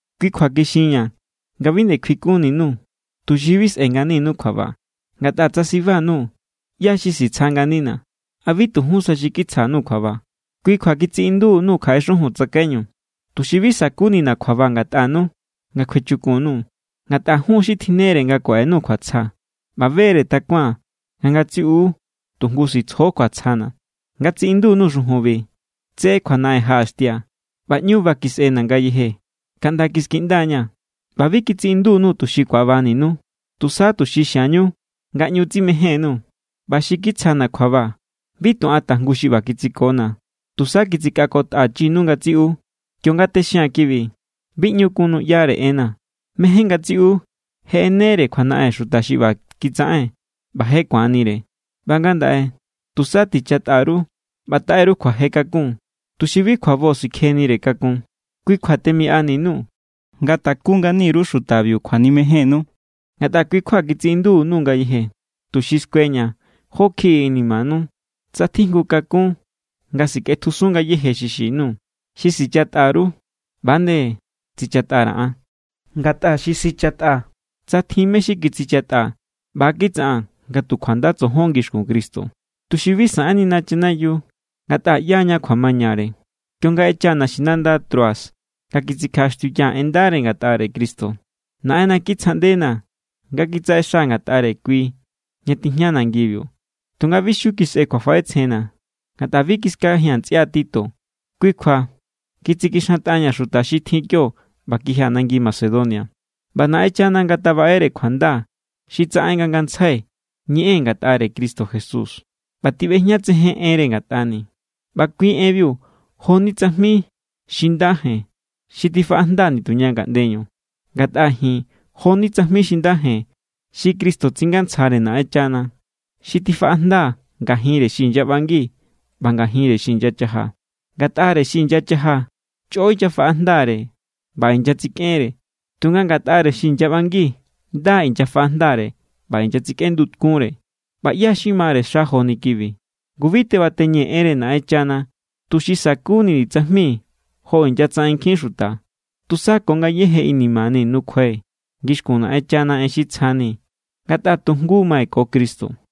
Kui kjua kixinña̱ nga bi nde kjuikunni_nuu̱, tuxi bi sꞌe̱ nganinu kjuaba. Ngatꞌa tsa siba_nuu̱, ¿ꞌyá= xi sitsja nganina̱? ¿A bi tu jún sa, xi kitsjanu kjuaba? Kui kjua kitsiꞌindu_nuu̱ kjaꞌe xujun tsakaiñu, tuxi bi sa̱kunina̱ kjuaba ngatꞌanu nga kjuechukun_nuu̱. Ngatꞌa jun= xi tjinnere nga kuaꞌenuu̱ kjuatsja. ꞌBa be=re takuaa̱n nga ngatsiꞌu tu jngu sitsjo kjuatsjana̱. Nga tsiꞌindu_nuu̱ xujunbiu tse kjuanaꞌen jaꞌaxtia̱ ꞌba ꞌñu ba kisꞌena̱ ngayeje kaꞌnda kiskiꞌnda=ña̱. ꞌBa bi kitsiꞌindu_nuu̱ tuxi ku̱abaninu, tusa tuxi xiañu nga ꞌñu tsimején_nuu̱. ꞌBa xi kitsjana̱ kjuaba, bi tu an tajngu xi ꞌba kitsikona̱, tusa kitsikꞌakotꞌachinu ngatsiꞌu. Kionga texia̱n kibi, bi ꞌñu kun nuꞌyare enna̱. Mejen ngatsiꞌu je ꞌenere kjuanaꞌen xuta xi ꞌba kitsaꞌen, ꞌba je ku̱anire. ꞌBa ngandaꞌe tusa tichatꞌa_ru ꞌba taꞌe_ru kjuaje kakun, tuxi bi kjuabo sikjenire kakun. Kui kjua temiꞌani_nuu̱ nga taku ngani_ru xutabiu kjuanimejénnu. Ngatꞌa kui kjua kitsiꞌinduni_nuu̱ ngayeje, tuxi skueña̱ jó kjiꞌi inimanu, tsa tjijngu kakún nga sikꞌetjusun ngayéje xi xin_nuu̱. Xi sichatꞌa_ru, ꞌba=nde tsichatꞌa_ra̱ an. Ngatꞌa xi sichatꞌaa̱, tsa tjin mé= xi kitsichatꞌaa̱, ꞌba= kitsaꞌaa̱n nga tu kjuanda tsojon ngixkun Cristo, tuxi bi saꞌennina chanayiu. Ngatꞌa ꞌyaña kjuamañare. Kionga ꞌechaa̱ naxinanda Troas nga kitsikjaꞌaxtiuyaa̱ en ndare ngatꞌare Cristo, Naꞌenna kitsjaꞌndena̱ nga kitsaꞌexaa̱ ngatꞌare kui ña tijña nangibiu. Tunga bi xiu kisꞌe kjuafaꞌetsjenna̱, ngatꞌa bi kiskajia̱n ntsꞌia Tito. Kui kjua kitsikixantꞌaña̱ xuta xi tjin kio ꞌba kijia̱ nangi Macedonia. ꞌBa Naꞌenchana ngatabaꞌere kjuanda xi tsaꞌen nga ngantsjai ñeꞌee̱n ngatꞌare Cristo Jesús ꞌba tiꞌbejñatsejen enre ngatꞌani̱. ꞌBa kui enbiu jo=ni tsajmi xi nda jen xi tifaꞌajnda nituña ngaꞌndeñu. Ngatꞌa ji̱n jo=ni tsajmi xi nda jen xi Cristo tsingantsjare Naꞌenchana, xi tifaꞌajnda ngajinre xi inyaꞌbangi ꞌba ngajinre xi inyachaja. Ngatꞌare xi inyachaja, chꞌo inyafaꞌajndare ꞌba inyatsikꞌenre. Tunga ngatꞌare xi inyaꞌbangi nda= inyafaꞌajndare ꞌba inyatsikꞌendukunre. ¿ꞌBa ꞌyá= xi mare xa joni kibi? Ngu bi tebateñee̱ enre Naꞌenchana tuxi sa̱kunini̱ tsajmi jo inyatsaꞌen nkjin xuta. Tusa ko ngayéje inimani̱ nukjuai̱ ngixkun Naꞌenchana en xi tsjani̱, ngatꞌa tu jngu= mai̱ ko Cristo.